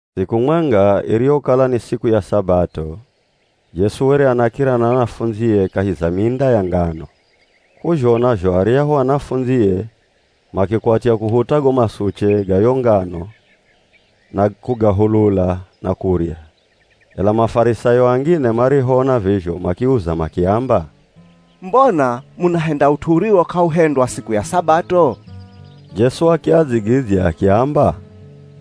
Siku mwenga iriyokala ni siku ya Sabato, Jesu were anakira na anafundzie kahi za minda ya ngano. K'uzhona zho aryahu anafundzie makikwatya kuhuta go masuche ga yo ngano na kugahulula na kurya. Ela Mafarisayo angine marihoona vizho makiauza makiamba, “Mbona munahenda ut'u uriwo k'auhendwa siku ya Sabato?” Jesu akiadzigidzya akiamba,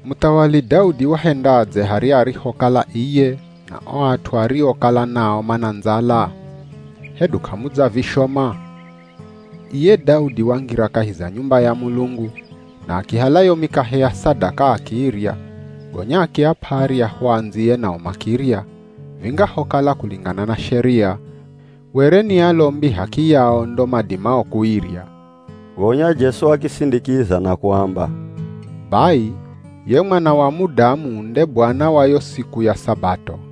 “Muthawali Daudi wahendadze harya arihokala iye na o at'u ariokala nao mana ndzala? Hedu k'amudzavishoma? Iye Daudi wangira kahi za nyumba ya Mulungu na akihala yo mikahe ya sadaka akiirya, gonya akiap'a aryahu andziye nao makirya, vingahokala kulingana na sheria, were ni alombi h'akiyao ndo madimao kuirya.” Gonya Jesu akisindikiza na kuamba, “Bai ye Mwana wa Mudamu nde Bwana wa yo siku ya Sabato.”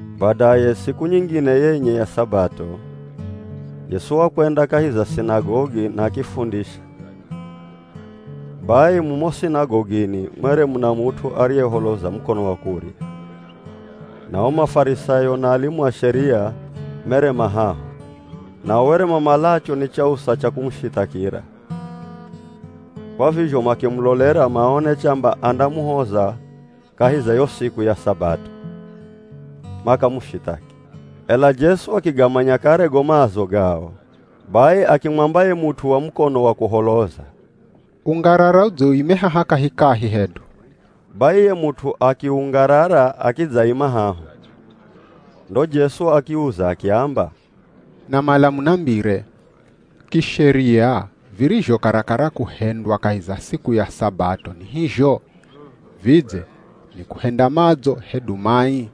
Badaye siku nyingine yenye ya Sabato, Jesu wakwenda kahi za sinagogi na akifundisha. Bai mumo sinagogini mwere muna mut'u ariyeholoza mukono wa kurya. Na o Mafarisayo na alimu a Sheria, mere ma haho, nao were mamalacho ni chausa cha kumushithakira, kwa vizho makimulolera maone chamba andamuhoza kahi za yo siku ya Sabato, makamushithaki. Ela Jesu akigamanya kare go maazo gao, bai akimwamba ye mut'u wa mukono wa kuholoza, “Ungarara udze uime haha kahikahi hedu.” Bai ye mut'u akiungarara akidzaima haho. Ndo Jesu akiauza akiamba, “Namala munambire, kisheria virizho karakara kuhendwa kahi za siku ya Sabato ni hizho? Vidze ni kuhenda madzo hedu mai?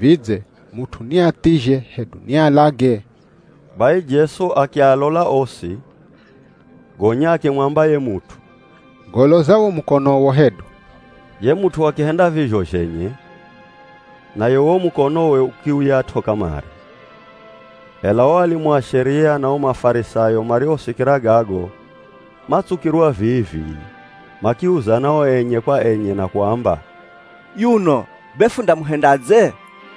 Vidze mut'u ni athizhe hedu ni alage?” Bai Jesu akialola osi, gonya akimwamba ye mut'u, “Goloza wo mukonowo hedu.” Ye mut'u akihenda vizho zhenye, naye wo mukonowe ukiuyat'o kamare. Ela o alimu a Sheria na o Mafarisayo marihosikira gago matsukirwa vii-vii, makiuzana o enye kwa enye na kuamba, “Yuno be fundamuhendadze?”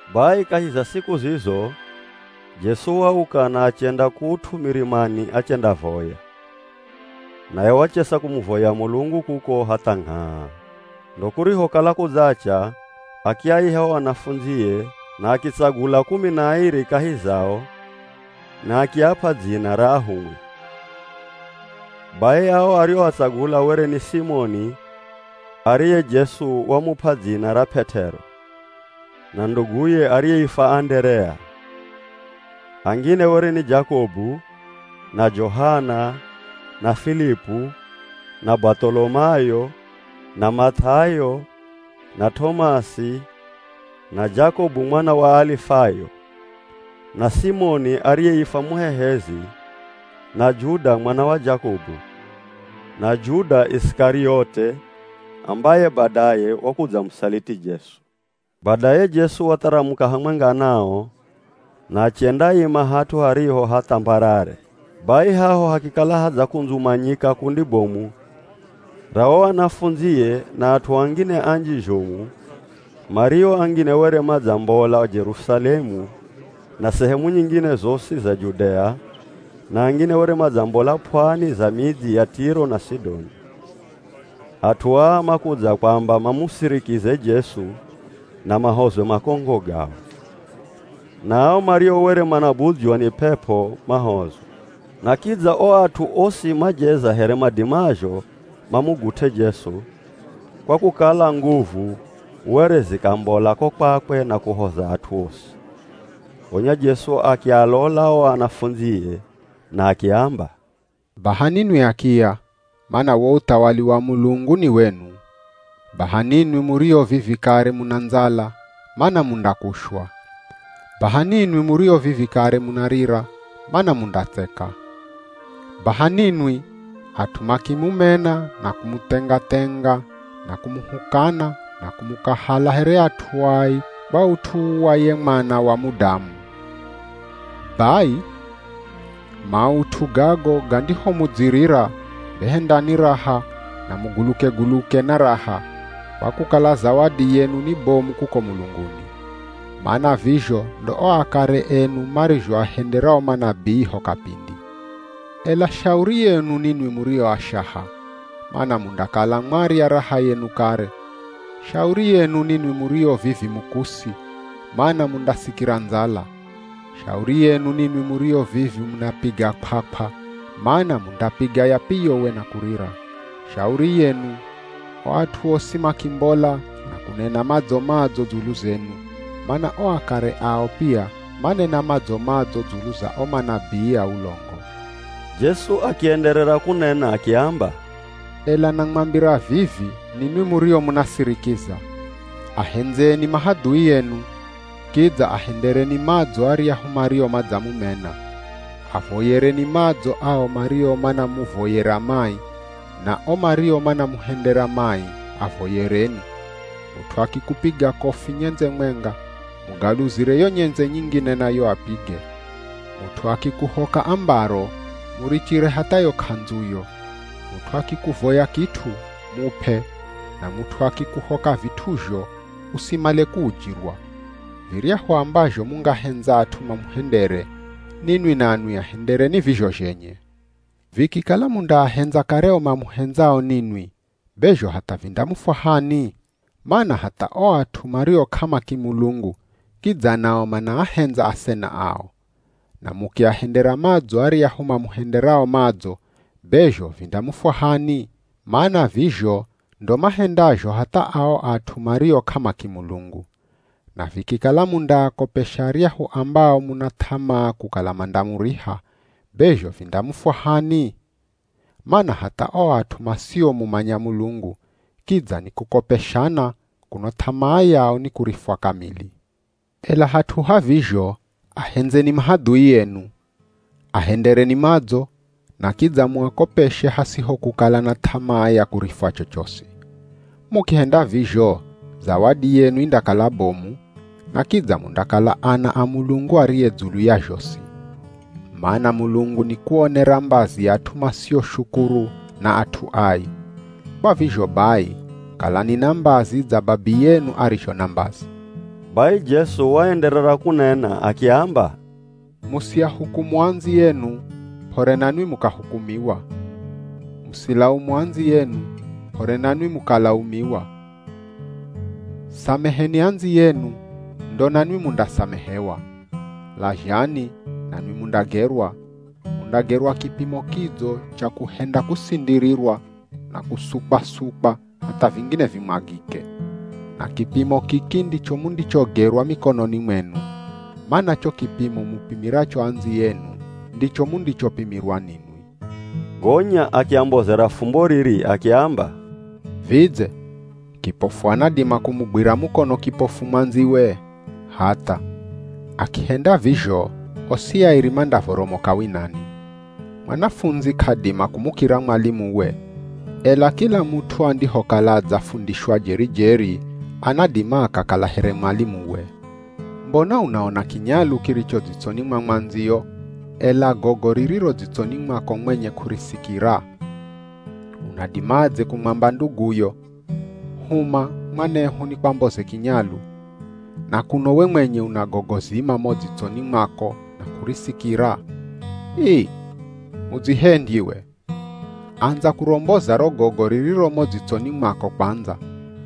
Bai kahi za siku zizo, Jesu wauka na achenda kut'u mirimani achendavoya. Naye wachesa kumuvoya Mulungu kuko hatha ngh'aa. Ndo kurihokala kudzacha akiaiha o anafundzie na akitsagula kumi na airi kahi zao na akiap'a dzina ra ahumwi. Bai ao arioatsagula were ni Simoni ariye Jesu wamup'a dzina ra P'et'ero, na nduguye ariyeifwa Anderea. Angine were ni Jakobu, na Johana, na Filipu, na Bath'olomayo, na Math'ayo, na T'omasi, na Jakobu mwana wa Alifayo, na Simoni ariyeifwa Muhehezi, na Juda mwana wa Jakobu, na Juda Isikariote ambaye badaye wakudzamusaliti Jesu. Badaye Jesu watharamuka hamwenga nao na achendaima hat'u hariho ha th'ambarare. Bai haho hakikala hadzakundzumanyika kundi bomu ra o anafundzie na at'u angine anji zhomu mario angine were madzambola Jerusalemu na sehemu nyingine zosi za Judea, na angine were madzambola p'wani za midzi ya Tiro na Sidoni. At'u aa makudza kwamba mamusirikize Jesu na mahozwe makongo gao. Na ao mario were manabudzywa ni p'ep'o mahozwa. Na kidza o at'u osi majeza here madimazho mamugut'e Jesu, kwa kukala nguvu were zikambola ko kwakwe na kuhoza at'u osi. Gonya Jesu akialola o anafundzie na akiamba, “Baha ninwi akiya, mana wo uthawali wa Mulungu ni wenu. Baha ninwi murio vivi kare muna ndzala, mana mundakushwa. Baha ninwi murio vivi kare munarira, mana mundatseka. Baha ninwi, at'u makimumena na kumuthenga-thenga na kumuhukana na kumukahala here at'u ai, kwa ut'u wa ye Mwana wa Mudamu. “Bai maut'u gago gandihomudzirira be hendani raha na muguluke-guluke na raha, kwa kukala zawadi yenu ni bomu kuko mulunguni. Mana vizho ndo o akare enu marizhoahendera o manabii ho kapindi. Ela shauri yenu ninwi murio ashaha, mana mundakala mwarya raha yenu kare. Shauri yenu ninwi murio vivi mukusi, mana mundasikira ndzala. Shauri yenu ninwi murio vivi munapiga kw'akw'a, mana mundapiga yapiyowe na kurira. Shauri yenu, o at'u osi makimbola na kunena madzo-madzo dzulu zenu, mana o akare ao pia manena madzo-madzo dzulu za o manabii a ulongo.” Jesu akienderera kunena akiamba, “Ela namwambira vivi ninwi murio munasirikiza, ahendzeni mahadhui enu, kidza ahendereni madzo aryahu mario madzamumena. Avoyereni madzo ao mario manamuvoyera mai, na o mario manamuhendera mai, avoyereni. Mut'u akikupiga kofi nyendze mwenga, mugaluzire yo nyendze nyingine nayo apige. Mut'u akikuhoka ambaro, murichire hatha yo k'andzuyo. Mut'u akikuvoya kit'u, mup'e, na mut'u akikuhoka vit'uzho, usimale kuujirwa. Viryahu ambazho mungahendza at'u mamuhendere, ninwi nanwi ahendereni vizho zhenye. “Vikikala mundaahendza kare o mamuhendzao ninwi, be zho hatha vindamufwahani? Mana hatha o at'u mario k'amakimulungu kidza nao manaahendza asena ao. Na mukiahendera madzo aryahu mamuhenderao madzo, be zho vindamufwahani? Mana vizho ndo mahendazho hatha ao at'u mario k'amakimulungu. Na vikikala mundaakopesha aryahu ambao muna th'amaa kukala mandamuriha, be zho vindamufwahani? Mana hatha o at'u masiomumanya Mulungu, kidza nikukopeshana, kuno th'amaa yao ni kurifwa kamili. Ela hat'u ha vizho ahendzeni mahadhui enu, ahendereni madzo, na kidza muakopeshe hasiho kukala na th'amaa ya kurifwa chochosi. Mukihenda vizho zawadi yenu indakala bomu, na kidza mundakala ana a Mulungu ariye dzulu ya zhosi. Mana Mulungu nikuonera mbazi at'u masioshukuru na at'u ai. Kwa vizho bai kalani na mbazi dza Babiyenu arizho na mbazi.” Bai Jesu waenderera kunena akiamba, “Musiahukumu andziyenu, p'ore nanwi mukahukumiwa. Musilaumu andziyenu, p'ore nanwi mukalaumiwa. Sameheni andziyenu, ndo nanwi mundasamehewa. Lazhani, nanwi mundagerwa, mundagerwa kipimo kidzo cha kuhenda kusindirirwa, na kusukwasukwa hatha vingine vimwagike. Na kipimo kiki ndicho mundichogerwa mikononi mwenu. Mana cho kipimo mupimiracho andziyenu ndicho mundichopimirwa ninwi.” Gonya akiambozera fumbo riri akiamba, “Vidze kipofu anadima kumugwira mukono kipofu mwandziwe? Hatha! Akihenda vizho osi airi mandavoromoka winani. Mwanafundzi k'adima kumukira mwalimuwe, ela kila mut'u andihokala adzafundishwa jeri-jeri, anadima akakala here mwalimuwe. Mbona unaona kinyalu kiricho dzitsoni mwa mwandziyo, ela gogo ririro dzitsoni mwako mwenye k'urisikira? Unadimadze kumwamba nduguyo, ‘Huma, mwanehu nikwamboze kinyalu,’ na kuno we mwenye una gogo zima mo dzitsoni mwako na k'urisikira. Ii! Mudzihendyi we! Andza kuromboza ro gogo ririro mo dzitsoni mwako kwandza,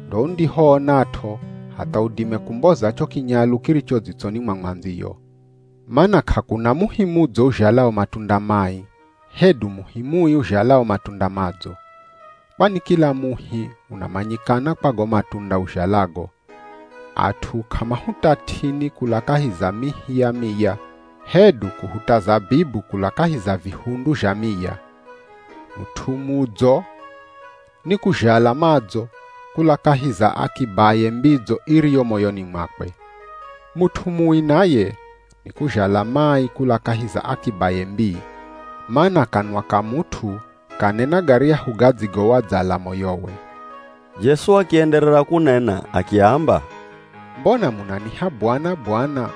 ndo undihoonat'o hatha udime kumboza cho kinyalu kiricho dzitsoni mwa mwandziyo.” “Mana k'akuna muhi mudzo uzhalao matunda mai, hedu muhi mui uzhalao matunda madzo. Kwani kila muhi unamanyikana kwa go matunda uzhalago. At'u k'amahuta t'ini kula kahi za mihi ya miya hedu kuhuta zabibu kula kahi za vihundu zha miya. Mut'u mudzo nikuzhala madzo kula kahi za akibaye mbidzo iriyo moyoni mwakwe. Mut'u mui naye nikuzhala mai kula kahi za akibaye mbii. Mana kanwa ka mut'u kanena garyahu gadzigowadzala moyowe.” Jesu akienderera kunena akiamba, “Mbona munaniha, ‘Bwana! Bwana!’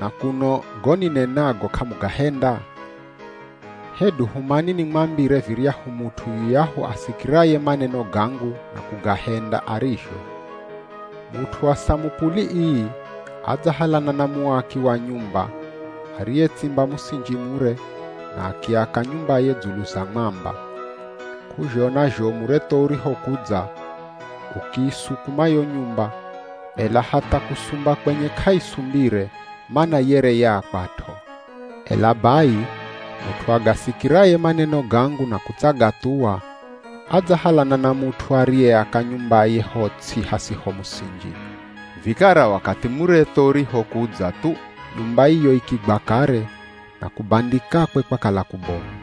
na kuno go ninenago k'amugahenda? Hedu humani nimwambire viryahu mut'u yuyahu asikiraye maneno gangu na kugahenda arizho. Mut'u wa samupuli ii adzahalana na muaki wa nyumba ariyetsimba musinji mure, na akiaka nyumbaye dzulu za mwamba. K'uzhona zho muretho urihokudza, ukiisukuma yo nyumba, ela hatha kusumba kwenye k'aisumbire, mana yere yaakwat'o. Ela bai mut'u agasikiraye maneno gangu na kutsagathuwa, adzahalana na mut'u ariyeaka nyumbaye ho ts'i hasiho musinji. Vikara wakathi muretho urihokudza thu, nyumba iyo ikigwa kare, na kubandikakwe kwakala kubomu.”